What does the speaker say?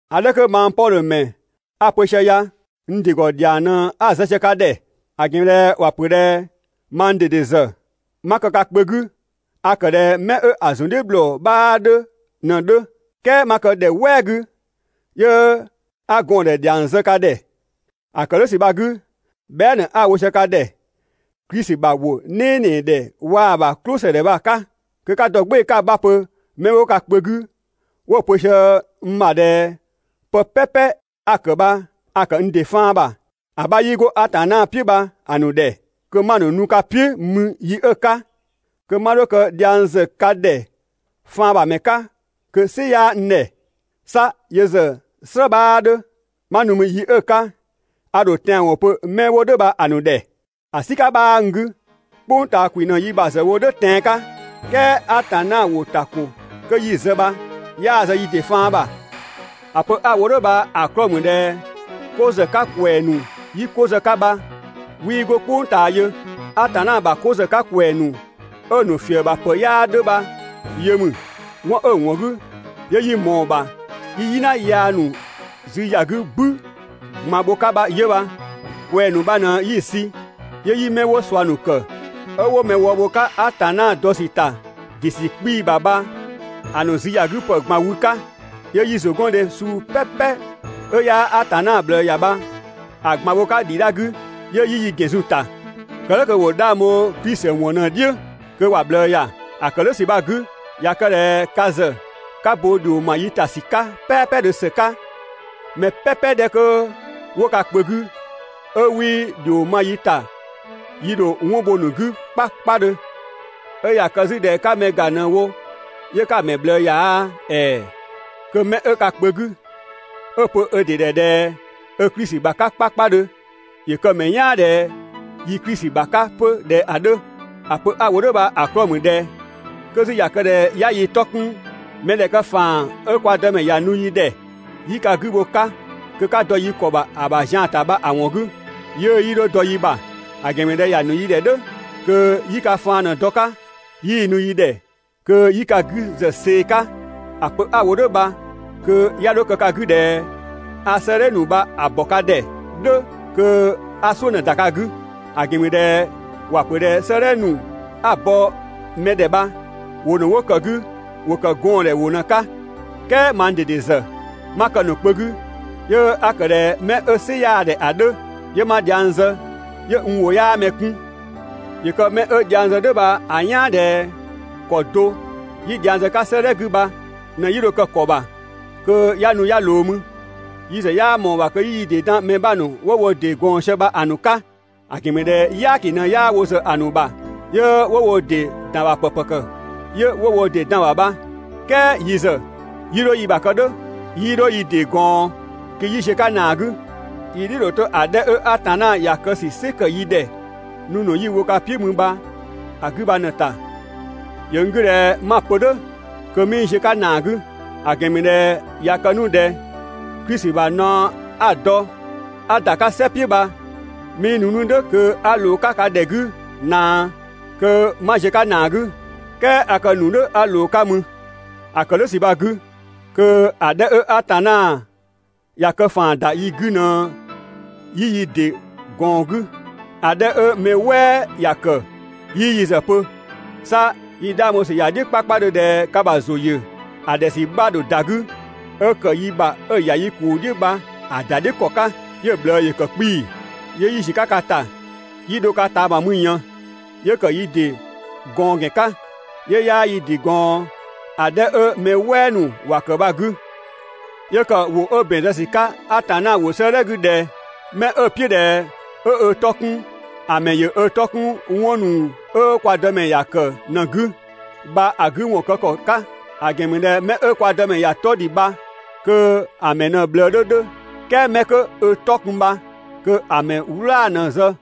‑A 'dhɛ 'kö mang Pɔdhö ‑mɛ 'a‑ pö sië ya n ‑dɩ ‑gɔ ‑dhiang ꞊në 'a‑ zë sië ka ‑dhɛ. ‑A ‑gɛn ‑mü ꞊dhɛ ‑wa ‑pö ꞊dhɛ mang ꞊dede ‑zë 'ma kë ka kpö 'gü a ‑kë ꞊dhɛ 'mɛ 'ö‑ zun "dhiʋ̈ ‑bhlɔ 'bhaa 'dhö ꞊në‑ 'dhö. "Kɛɛ 'ma kë ‑dhɛ "wɛɛ 'gü 'yö 'a gɔɔn‑ ‑dhɛ ‑dhiang zë ka ‑dhɛ. ‑A ‑kë "dhʋ̈ ‑sü bha‑ 'gü, bhɛa" ꞊në 'a‑ wo sië ka ‑dhɛ Klisi ‑bha ‑wʋ "nɛɛnɛɛ ‑dhɛ waa‑ ‑bha "klʋsëdhɛ bha‑ 'ka, kö 'ka dɔ "gbɩɩ‑ 'ka‑ 'bha pö 'mɛ 'wo ka kpö 'gü 'wo‑ pö sië n ‑bha ꞊dhɛ pë "pɛpɛ 'a‑ kë bha a‑ ‑kë n ‑dɩ faan ‑bha, ‑a 'bha 'yii 'go Atanna "piʋ̈ bha‑ ‑nu ‑dhɛ, kö 'ma ‑nu nu ka "piʋ̈ mü yi 'ö‑ 'ka, kö 'ma 'dho kë dhiang ‑zë ka ‑dhɛ faan ‑bha ‑mɛ 'ka kö‑ "sɩ 'yaa n ‑dhɛ. 'Sa yö ‑zë "slë 'bhaa 'dhö, 'ma nu mü yi 'ö‑ 'ka a ‑dho tɛanwɔn pö 'mɛ 'wo "dhʋ̈ bha‑ ‑nu ‑dhɛ, ‑a "sika 'bhaa n 'gü. "Kpʋng ꞊taa ‑kwi ꞊në yi ‑bha ‑zë wo "dhʋ̈ tɛan‑ 'ka "kɛɛ Atanna ‑wʋ ‑ta ‑ko 'kö 'yi‑ zë bha 'yaa‑ zë yi ‑dɩ faan ‑bha. ‑A pö 'a‑ wo "dhʋ̈ bha‑ 'klɔɔ‑ ‑mü ꞊dhɛ 'ko ‑zë 'ka ‑kwɛɛ ‑nu 'yi ko zë‑ 'ka bha 'wii 'go "kpʋng ꞊taa yö. Atanna ‑bha ko ‑zë 'ka ‑kwɛɛ ‑nu 'ö‑ ‑nu ‑fië ‑bha ‑pë 'yaa 'dhö bha yö ‑mü. 'Wɔn 'ö‑ ‑wɔn 'gü 'yö 'yi mɔɔ‑ ‑bha 'yi "yina yaa ‑nu zü ‑ya 'gü "bü ꞊gban bho‑ 'ka bha 'yö bha. ꞊Kwɛɛ‑ ‑nu bha ꞊në 'yi‑ sü 'yö 'yi 'mɛ 'wo ꞊sua ‑nu ‑kë 'ö 'wo mɛ wë bho‑ 'ka Atanna dɔ ‑sü ‑ta ‑dɩ ‑sü 'kpii‑ ‑bha bha‑ ‑nu züyagüpë ꞊gban wü‑ 'ka, 'yö 'yi ‑zʋgɔndhe suu "pɛpɛ 'ö 'yaa Atanna ꞊bhlë ‑ya bha‑ ꞊gban bho‑ 'ka ‑dhidha 'gü 'yö 'yi yi ‑gɛn zun‑ ‑ta, kë "dhʋ̈ kö ‑wo 'dhang bho Yesu Klisi ‑wɔn ꞊në‑ "dhiʋ̈ kö ‑wa ꞊bhlë ‑ya. ‑A ‑kë "dhʋ̈ ‑sü bha‑ 'gü, ꞊ya kë ꞊dhɛ ka ‑zë 'ka bo ‑dhio ‑ma yi ‑ta ‑sü 'ka "pɛɛpɛdhö ‑së 'ka, mɛ "pɛpɛ 'dhɛ 'kö 'wo ka kpö 'gü 'ö 'wii ‑dhio ma yi ‑ta yi ‑dho 'wɔn bho‑ ‑nu 'gü 'kpakpadhö. 'Ö ꞊ya kë 'zü ꞊dhɛ 'ka mɛ ‑ga ꞊në‑ wo 'yö 'ka‑ ‑mɛ ꞊bhlë ‑ya aa, ‑ɛɛ! Kö mɛ 'ö ka kpö 'gü 'ö‑ pö 'ö ‑dɩ ‑dhɛ ꞊dhɛ 'ö Klisi ‑bha 'ka 'kpakpadhö, ‑yö kë‑ ‑mɛ "yaan ꞊dhɛ yi Klisi ‑bha 'ka 'pö ꞊dhɛ ‑a 'dhö. ‑A pö 'a‑ wo "dhʋ̈ bha‑ 'klɔɔ‑ ‑mü ꞊dhɛ 'kö 'zü ꞊ya kë ꞊dhɛ 'ya yi 'tɔ 'kun mɛdhɛkë ‑faan 'ö Atanna ‑ya nu yi ‑dhɛ kö 'yi ka 'gü bho‑ 'ka kö 'ka dɔ yi ‑kɔ ‑bha ‑a ‑bha zian ‑ta bha‑ ‑wɔn 'gü, 'yiʋ̈‑ 'yii 'dho dɔ yi ‑bha, ‑a ‑gɛn ‑mü ꞊dhɛ ‑ya ‑nu yi ‑dhɛ "dhʋ̈ kö 'yi ka faan ꞊në‑ dɔ‑ 'ka, 'yii nu yi ‑dhɛ kö 'yi ka 'gü ‑zë see‑ 'ka. ‑A pö 'a‑ wo "dhʋ̈ bha kö 'ya 'dho kë ka 'gü ꞊dhɛ a 'sëëdhɛ ‑nu bha‑ ‑bɔ ka ꞊dhɛ "dhʋ̈ kö 'a "suʋ̈ ꞊në‑ ‑da ka 'gü. ‑A ‑gɛn ‑mü ꞊dhɛ ‑wa pö ꞊dhɛ "sëëdhɛ ‑nu 'a‑ bɔ mɛ ‑dhɛ bha ‑wʋ ‑nu 'wo ‑kë 'gü bha ‑wo ‑kë gɔɔndhɛ ‑wʋ ꞊në‑ 'ka. "Kɛɛ mang ꞊dede ‑zë 'ma kë‑ ‑nu kpö 'gü 'yö 'a ‑kë ꞊dhɛ 'mɛ 'ö "sɩ 'yaa‑ ‑dhɛ ‑a 'dhö, 'yö 'ma dhiang zë 'yö n ‑wʋ 'yaa mɛ 'kun. ‑Yö kë mɛ 'ö dhiang zë "dhʋ̈ bha‑ "yaan ꞊dhɛ ‑kɔ do 'yi dhiang zë‑ 'ka 'sëëdhɛ 'gü bha ꞊në 'yi dho‑ kë‑ ‑kɔ ‑bha kö 'ya nu 'ya ꞊loo mü. Yi ‑zë 'yaa ꞊mɔɔ‑ ‑bha kö 'yi yi ‑dɩ ‑dan mɛ 'bha ‑nu 'wo wo ‑dɩ ꞊gɔɔn sië bha‑ ‑nu 'ka. ‑A ‑gɛn ‑mü ꞊dhɛ "yaaki ꞊në 'yaa wo ‑zë ‑a ‑nu ‑bha 'yö 'wo wo ‑dɩ ‑dan ‑bha ‑pë ‑pëkë 'yö 'wo wo ‑dɩ dan‑ ‑bha bha. "Kɛɛ yi ‑zë 'yii 'dho yi ‑bha kë "dhʋ̈, 'yii 'dho yi ‑dɩ ꞊gɔɔn kö 'yi ziö‑ 'ka ‑naa 'gü. Yi "dhiʋ̈‑ ‑dho 'to‑ 'dhɛ 'ö Atanna ‑ya kë ‑sü "sɩ ‑kë yi ‑dhɛ nu ‑nu 'yi‑ wo ka "piʋ̈ mü bha‑ 'gü bha ꞊në‑ ‑ta. ‑Yö n 'gü ꞊dhɛ 'ma‑ pö "dhʋ̈ kö 'mii ziö‑ 'ka ‑naa 'gü. ‑A ‑gɛn ‑mü ꞊dhɛ ꞊ya kë 'nu ꞊dhɛ Klisi ‑bha naɔ 'a‑ dɔ 'a ‑da 'ka "sɛ "piʋ̈ bha 'mii ‑nu 'nu "dhʋ̈ kö 'a ꞊loo 'nu‑ 'ka ka ‑dhɛ 'gü ꞊naa, kö 'ma ziö‑ 'ka ‑naa 'gü. "Kɛɛ a kë ‑nu "dhʋ̈ 'a ꞊loo‑ 'ka mü. ‑A ‑kë "dhʋ̈ ‑sü bha‑ 'gü, kö ‑a 'dhɛ 'ö Atanna ‑ya kë ‑faan ‑da yi 'gü ꞊në 'yi yi ‑dɩ ꞊gɔɔn‑ 'gü, ‑a 'dhɛ 'ö mɛ "wɛɛ ‑ya ‑kë 'yii yö ‑zë pö. 'Sa yi 'dhang bho ‑sü ‑ya "dhiʋ̈ 'kpakpadhö ꞊dhɛ ka ‑bha ‑zʋ ‑yö ‑a ‑dhɛ ‑sü 'bha‑ ‑dho ‑da 'gü 'ö ‑kë yi ‑bha 'ö‑ ‑ya yi ‑kuu "dhiʋ̈ bha‑ ‑da "dhiʋ̈ ‑kɔ 'ka, 'yö‑ ꞊bhlë ‑yö ‑kë 'kpii‑. 'Yö 'yi ‑ziö 'ka ka ‑ta 'yi dho‑ ka ꞊taama mü ꞊yën, 'yö ‑kë yi ‑dɩ ꞊gɔɔn ‑gɛn 'ka, 'yö 'yaa yi ‑dɩ gɔɔn ‑a 'dhɛ 'ö mɛ "wɛɛ ‑nu ‑wa ‑kë bha‑ 'gü, 'Yö ‑kë ‑wʋ 'ö ‑bɛn zë ‑sü 'ka Atanna ‑wʋ 'sëëdhɛ 'gü ꞊dhɛ: «'Mɛ 'ö‑ "piʋ̈ ꞊dhɛ 'ö ö 'tɔ 'kun ‑a ‑mɛ ‑yö ö 'tɔ 'kun ‑wɔn ‑nu 'ö kwa Dëmɛ ‑ya ‑kë ꞊në‑ 'gü» bha‑ 'gü ‑wɔn kë ‑kɔ 'ka. ‑A ‑gɛn ‑mü ꞊dhɛ 'mɛ 'ö kwa Dëmɛ ‑ya 'tɔ ‑dhi bha kö‑ ‑mɛ ꞊në‑ ꞊bhlë 'dhö 'dhö, "kɛɛ 'mɛ 'kö ö 'tɔ kun bha kö‑ ‑mɛ "wlaa‑ ꞊në‑ zë.